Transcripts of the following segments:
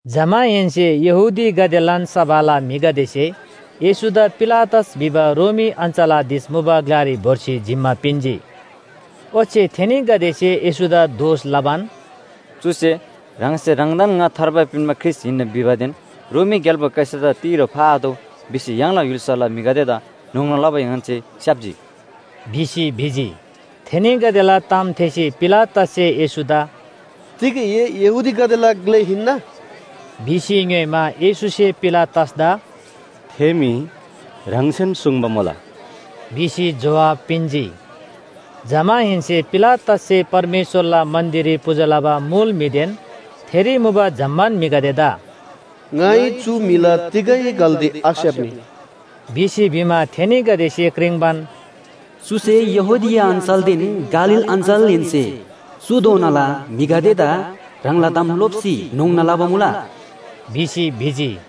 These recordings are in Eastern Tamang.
जमाहेन्‍से यहूदीगदेलान सभाला म्‍हिगदेसे येशूदा पिलातस भिबा रोमी अञ्‍चलाधीश मुबा ग्‍लारी भोर्सी जिम्‍मा पिन्‍जी। ओच्‍छे थेनीगदेसे येशूदा दोष लबान, “चुसे ह्राङसे ह्राङदान ङा थार्बा पिन्‍बा ख्रीष्‍ट हिन्‍ना भिबादेन रोमी ग्‍याल्‍बो कैसरदा तिरो फाआतोः भिसी य्‍हाङला य्‍हुल्‍साला म्‍हिगदेदा न्‍होङ्ना लबा ङन्‍से स्‍याप्‍जी” भिसी भिजी। थेनीगदेला ताम थेःसी पिलातससे येशूदा “तिग ए यहूदीगदेला ग्‍ले हिन्‍ना?” भिसी ङ्‌योइमा, येशूसे पिलातसदा “थे मी ह्राङसेन सुङ्बा मुला” भिसी जोहाब पिन्‍जी। जमाहेन्‍से पिलातससे परमेश्‍वरला मन्‍दिररी पूजा लबा मुल म्‍हिदेन थेरी मुबा जम्‍मान म्‍हिगदेदा “ङाइ चु म्‍हिला तिगै गल्‍ती आस्‍याप्‍नी” भिसी भिमा, थेनीगदेसे क्रिङ्बान, “चुसे यहूदिया अञ्‍चलदेन गालील अञ्‍चलहेन्‍से चुधोनाला म्‍हिगदेदा ह्राङला ताम लोप्‍सी न्‍होङ्ना लबा मुला” भिसी भिजी।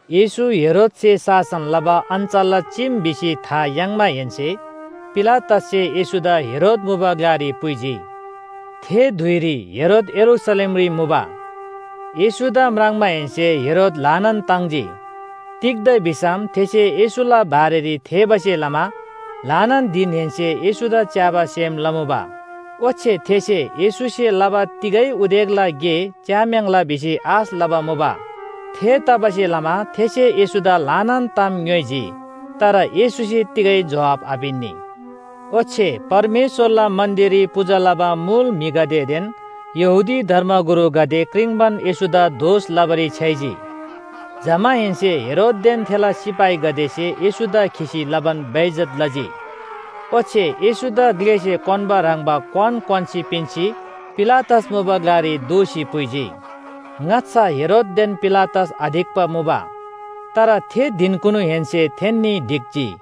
येशू हेरोदसे शासन लबा अञ्‍चलला चीम भिसी था याङ्माहेन्‍से पिलातससे येशूदा हेरोद मुबा ग्‍लारी पुइजी। थे धुइरी हेरोद यरूशलेमरी मुबा। येशूदा म्राङ्माहेन्‍से हेरोद ल्‍हानान ताङ्जी। तिग्‍दा भिसम थेसे येशूला बारेरी थेःबासे लमा ल्‍हानान धिनहेन्‍से येशूदा च्‍याबा सेम लमुबा। ओच्‍छे थेसे येशूसे लबा तिगै उदेकला गे च्‍याम्‍याङ्ला भिसी आश लबा मुबा। थेतबासेलमा थेसे येशूदा ल्‍हानान ताम ङ्‌योइजी तर येशूसे तिगै जोहाब आपिन्‍नी। ओच्‍छे परमेश्‍वरला मन्‍दिररी पूजा लबा मुल म्‍हिगदेदेन यहूदी धर्मगुरुगदे क्रिङ्बान येशूदा दोष लबारी छ्‌याइजी। जमाहेन्‍से हेरोददेन थेला सिपाहीगदेसे येशूदा खिसी लबान बेइज्‍जत लजी। ओच्‍छे येशूदा ग्‍लेसे क्‍वान्‍बा ह्रङ्‌बा क्‍वान क्‍वान्‍सी पिन्‍सी पिलातस मुबा ग्‍लारी दोःसी पुइजी। ङाच्‍छा हेरोददेन पिलातस आढिक्‍बा मुबा। तर थे धिनकुनुहेन्‍से थेन्‍नी ढिक्‍जी।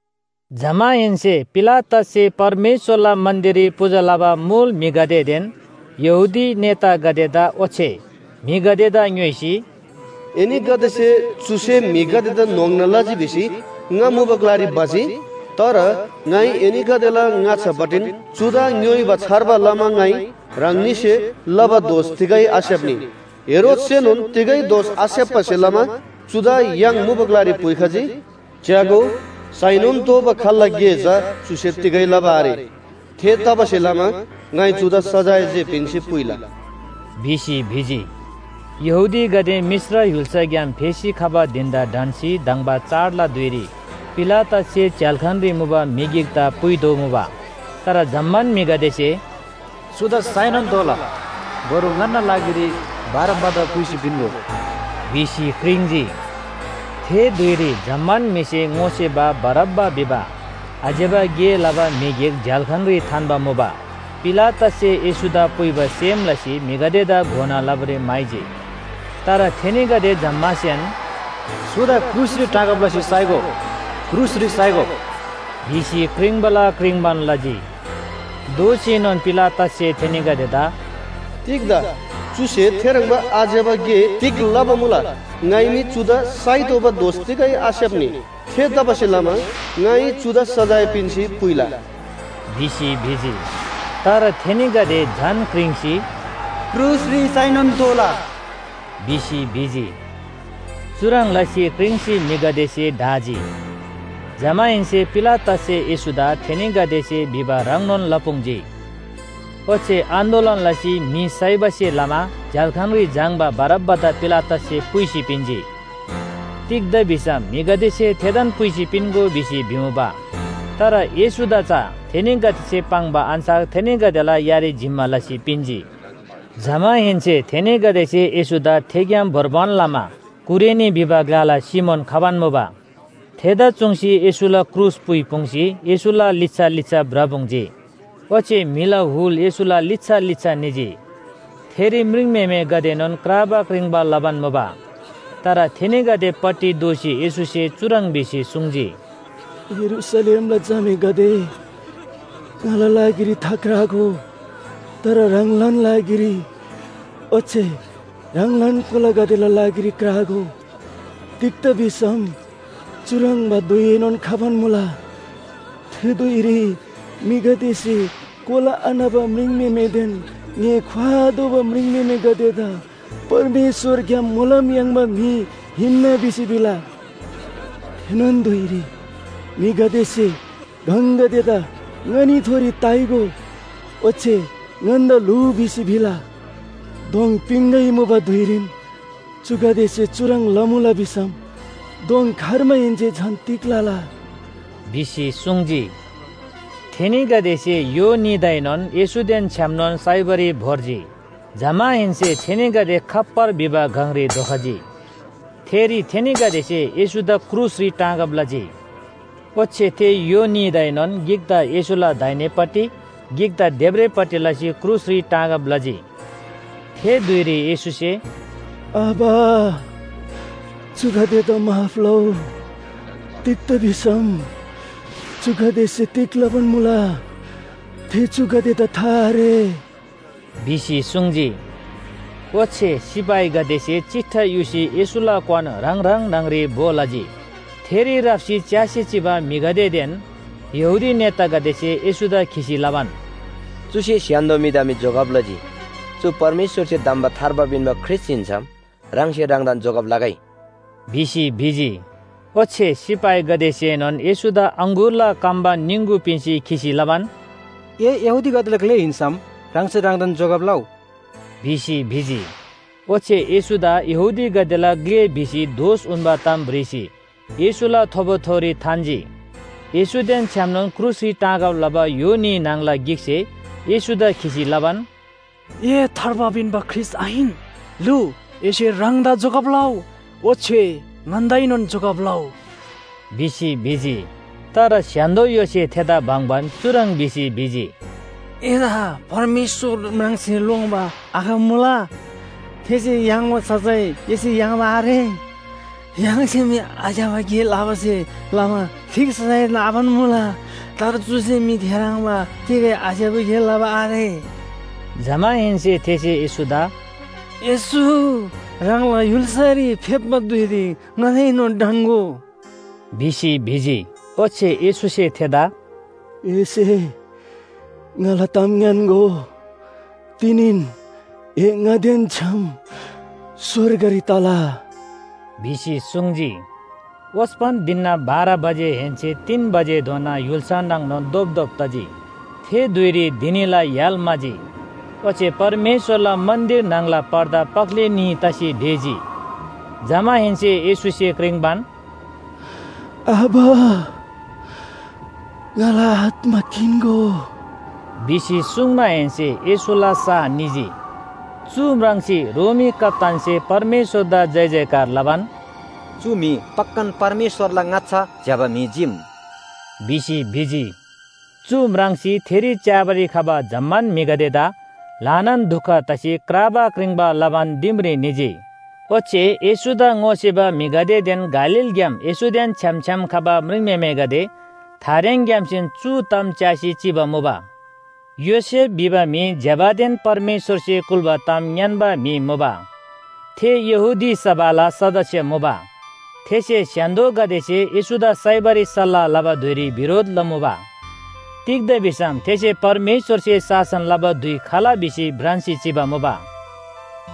जमाहेन्‍से पिलातससे परमेश्‍वरला मन्‍दिररी पूजा लबा मुल म्‍हिगदेदेन यहूदी नेतागदेदा ओच्‍छे म्‍हिगदेदा ङ्‌योइसी, “एनीगदेसे चुसे म्‍हिगदेदा न्‍होङ्ना लजी भिसी ङा मुबा ग्‍लारी भजी, तर ङाइ एनीगदेला ङाच्‍छापट्टिन चुदा ङ्‌योइबा छार्बा लमा ङाइ ह्राङनीसे लबा दोष तिगै आस्‍याप्‍नी। हेरोदसेएनोन तिगै दोष आस्‍याप्‍बासे लमा चुदा य्‍हाङ मुबा ग्‍लारी पुइखजी। च्‍यागो, साइनोन तोःबा खाल्‍ला गे चा चुसे तिगै लबा आरे। थेतबासेलमा ङाइ चुदा सजाय जे पिन्‍सी पुइला” भिसी भिजी। यहूदीगदे मिश्र य्‍हुल्‍साग्‍याम फेसी खबा धिन‍दा ढन्‍सी धङ्बा चाडला धुइरी पिलातससे झ्‍याल्‍खानरी मुबा म्‍हि गिकदा पुइतोःमुबा। तर जम्‍मान म्‍हिगदेसे “चुदा साइनोन तोःला, बरु ङन्‍ना लागिरी बारब्‍बादा पुइसी पिन्‍गो” भिसी क्रिङ्‌जी। थे धुइरी जम्‍मान म्‍हिसे ङोसेबा बारब्‍बा भिबा आज्‍यबा गे लबा म्‍हि गिक झ्‍याल्‍खानरी थान्‍बा मुबा। पिलातससे येशूदा पुइबा सेम लसी म्‍हिगदेदा घोना लबारी म्‍हाइजी। तर थेनीगदे जम्‍मासेन, “चुदा क्रुसरी टाँगब लसी साइगो, क्रुसरी साइगो!” भिसी क्रिङ्बाला क्रिङ्बान लजी। दोःसीएनोन पिलातससे थेनीगदेदा “तिग्‍दा? चुसे थेह्रङ्बा आज्‍यबा गे तिग लबा मुला? ङाइ मी चुदा साइतोःबा दोष तिगै आस्‍याप्‍नी। थेतबासेलमा ङाइ चुदा सजाय पिन्‍सी पुइला” भिसी भिजी। तर थेनीगदे झन क्रिङ्सी, “क्रुसरी साइनोन तोःला” भिसी भिजी। चुह्रङ् लसी क्रिङ्सी म्‍हिगदेसे ढाजी। जमाहेन्‍से पिलातससे येशूदा थेनीगदेसे भिबा ह्रङ्नोन लपुङ्जी। ओच्‍छे आन्‍दोलन लसी म्‍हि साइबासे लमा झ्‍याल्‍खानरी झाङ्‌बा बारब्‍बादा पिलातससे पुइसी पिन्‍जी। तिग्‍दा भिसम म्‍हिगदेसे थेदान पुइसी पिन्‍गो भिसी भिमुबा। तर येशूदा चा थेनीगदेसे पाङ्बा अन्‍छार थेनीगदेला यारी जिम्‍मा लसी पिन्‍जी। जमाहेन्‍से थेनीगदेसे येशूदा थेग्‍याम भोर्बान लमा कुरेनी भिबा ग्‍लाला सिमोन खबान मुबा। थेदा चुङ्सी येशूला क्रुस पुइपुङ्सी येशूला लिच्‍छा लिच्‍छा भ्रपुङ्जी। ओच्‍छे म्‍हिला हुल येशूला लिच्‍छा लिच्‍छा निजी। थेरी म्रिङम्‍हेमेगदेएनोन क्राबा क्रिङ्बा लबान मुबा। तर थेनीगदेपट्टि दोःसी येशूसे चुह्रङ् भिसी सुङ्जी, “यरूशलेमला झामेगदे, ङाला लागिरी थाक्रागो, तर ह्राङलान लागिरी ओच्‍छे ह्राङलान कोलागदेला लागिरी क्रागो। तिग्‍दा भिसम चुह्रङ्बा धुइएनोन खबान मुला। थे धुइरी म्‍हिगदेसे कोला आन्‍हबा म्रिङम्‍हेमेदेन ङ्‍हे ख्‍वाआतोःबा म्रिङम्‍हेमेगदेदा परमेश्‍वरग्‍याम मोलम याङ्बा म्‍हि हिन्‍ना भिसी भिला। थेनोन धुइरी म्‍हिगदेसे गङगदेदा ङनीथोरी ताइगो ओच्‍छे ङन्‍दा ल्‍हुउ भिसी भिला। दोङ पिङगै मुबा धुइरीन चुगदेसे चुह्रङ् लमुला भिसम दोङ खर्माहेन्‍से झन तिग लला?” भिसी सुङ्जी। थेनीगदेसे य्‍हो न्‍हीदाएनोन येशूदेन छ्‌यामनोन साइबारी भोर्जी। जमाहेन्‍से थेनीगदे खप्‍पर भिबा गङरी धोखजी। थेरी थेनीगदेसे येशूदा क्रुसरी टाँगब लजी। ओच्‍छे थे य्‍हो न्‍हीदाएनोन गिकदा येशूला दाहिनेपट्टि, गिकदा देब्रेपट्टि लसी क्रुसरी टाँगब लजी। थे धुइरी येशूसे “आबा, चुगदेदा माफ लउ। तिग्‍दा भिसम चुगदेसे तिग लबान मुला थे चुगदेदा था आरे” भिसी सुङ्जी। ओच्‍छे सिपाहीगदेसे चिट्ठा युसी येशूला क्‍वान ह्राङ ह्राङ न्‍हङरी भो लजी। थेरी राप्‍सी च्‍यासी चिबा म्‍हिगदेदेन यहूदी नेतागदेसे येशूदा खिसी लबान, “चुसे स्‍य्‍हान्‍दो म्‍हिदा मी जोगब लजी। चु परमेश्‍वरसे धम्‍बा थार्बा पिन्‍बा ख्रीष्‍ट हिन्‍सम ह्राङसे ह्राङदान जोगब लगै” भिसी भिजी। ओच्‍छे सिपाहीगदेसेएनोन येशूदा अङगुरला कम्‍बा निङगु पिन्‍सी खिसी लबान, “ए यहूदीगदेला ग्‍ले हिन्‍सम ह्राङसे ह्राङदान जोगब लउ” भिसी भिजी। ओच्‍छे येशूदा “यहूदीगदेला ग्‍ले” भिसी दोष उन्‍बा ताम भ्रिसी येशूला थोबोथोरी थान्‍जी। येशूदेन छ्‌यामनोन क्रुसरी टाँगब लबा य्‍हो न्‍ही न्‍हङला गिकसे येशूदा खिसी लबान, “ए थार्बा पिन्‍बा ख्रीष्‍ट आहिन? लु, एसे ह्राङदा जोगब लउ, ओच्‍छे ङन्‍दाएनोन जोगब लउ” भिसी भिजी। तर स्‍य्‍हान्‍दो य्‍होसे थेदा बङ्‍बान चुह्रङ् भिसी सुङ्जी, “एदा परमेश्‍वर म्राङ्सी लोङ्‌बा आखमुला? थेसे याङ्बा सजाय एसे याङ्बा आरे? य्‍हाङसे मी आज्‍यबा गे लबासे लमा ठीक सजाय नाबान मुला, तर चुसे मी थेह्रङ्बा तिगै आज्‍यबा गे लबा आरे।” जमाहेन्‍से थेसे येशूदा “येशू, ह्राङला य्‍हुल्‍सारी फेप्‍बा धुइरी ङादाएनोन ढन्‍गो” भिसी भिजी। ओच्‍छे येशूसे थेदा “एसे ङाला ताम ङ्‌यान्‍गो, तिनीन ए ङादेन छ्‌याम स्‍वर्गरी तला” भिसी सुङ्जी। ओस्‍पन धिनना बाह्र बजेहेन्‍से तीन बजेधोना य्‍हुल्‍सा नाङनोन धोपधोप तजी। थे धुइरी धिनीला य्‍हाल म्‍हाजी, ओच्‍छे परमेश्‍वरला मन्‍दिर न्‍हङला पर्दा पख्‍ले न्‍ही तसी ढेजी। जमाहेन्‍से येशूसे क्रिङ्बान, “आबा, ङाला आत्‍मा किन्‍गो” भिसी सुङ्माहेन्‍से येशूला सा निजी। चु म्राङ्सी रोमी कप्‍तानसे परमेश्‍वरदा जयजयकार लबान, “चु म्‍हि पक्‍कान परमेश्‍वरला ङाच्‍छा ज्‍यबा म्‍हि चीम” भिसी भिजी। चु म्राङ्सी थेरी च्‍याबारी खबा जम्‍मान म्‍हिगदेदा ल्‍हानान दुख तसी क्राबा क्रिङ्बा लबान दिमरी निजी। ओच्‍छे येशूदा ङोसेबा म्‍हिगदेदेन गालीलग्‍याम येशूदेन छ्‌याम छ्‌याम खबा म्रिङम्‍हेमेगदे थारेङग्‍यामसेन चु ताम च्‍यासी चिबा मुबा। योसेफ भिबा म्‍हि ज्‍यबादेन परमेश्‍वरसे कुल्‍बा ताम ङ्‌यान्‍बा म्‍हि मुबा। थे यहूदी सभाला सदस्‍य मुबा। थेसे स्‍य्‍हान्‍दोगदेसे येशूदा साइबारी सल्‍लाह लबा धुइरी बिरोध लमुबा। तिग्‍दा भिसम थेसे परमेश्‍वरसे शासन लबा धुइ खला भिसी भ्रान्‍सी चिबा मुबा।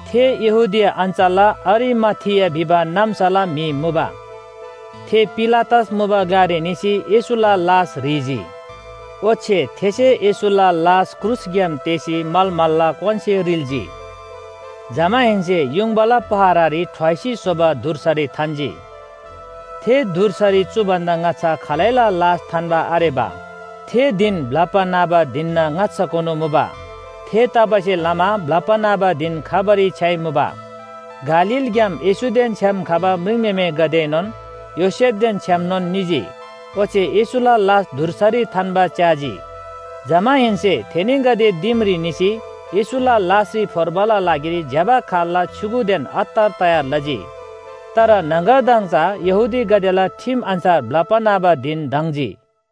थे यहूदिया अञ्‍चलला अरिमाथिया भिबा नाम्‍साला म्‍हि मुबा। थे पिलातस मुबा ग्‍लारी निसी येशूला लास ह्रीजी। ओच्‍छे थेसे येशूला लास क्रुसग्‍याम तेःसी मलमलला क्‍वानसे रिल्‍जी। जमाहेन्‍से युङबाला पहरारी ठ्वाइसी स्‍होबा धुर्सारी थान्‍जी, थे धुर्सारी चु भन्‍दा ङाच्‍छा खालैला लास थान्‍बा आरेबा। थे धिन ब्‍लप्‍बा न्‍हबा धिनना ङाच्‍छाकुनु मुबा। थेतबासेलमा ब्‍लप्‍बा न्‍हबा धिन खबारी छ्‌याइमुबा। गालीलग्‍याम येशूदेन छ्‌याम खबा म्रिङम्‍हेमेगदेएनोन योसेफदेन छ्‌यामनोन निजी ओच्‍छे येशूला लास धुर्सारी थान्‍बा च्‍याजी। जमाहेन्‍से थेनीगदे दिमरी निसी येशूला लासरी फोर्बाला लागिरी ज्‍यबा खाल्‍ला छ्‌युगुदेन अत्तर तयार लजी। तर न्‍हङगरदङ चा यहूदीगदेला ठिम अन्‍छार ब्‍लप्‍बा न्‍हबा धिन धङ्‍जी।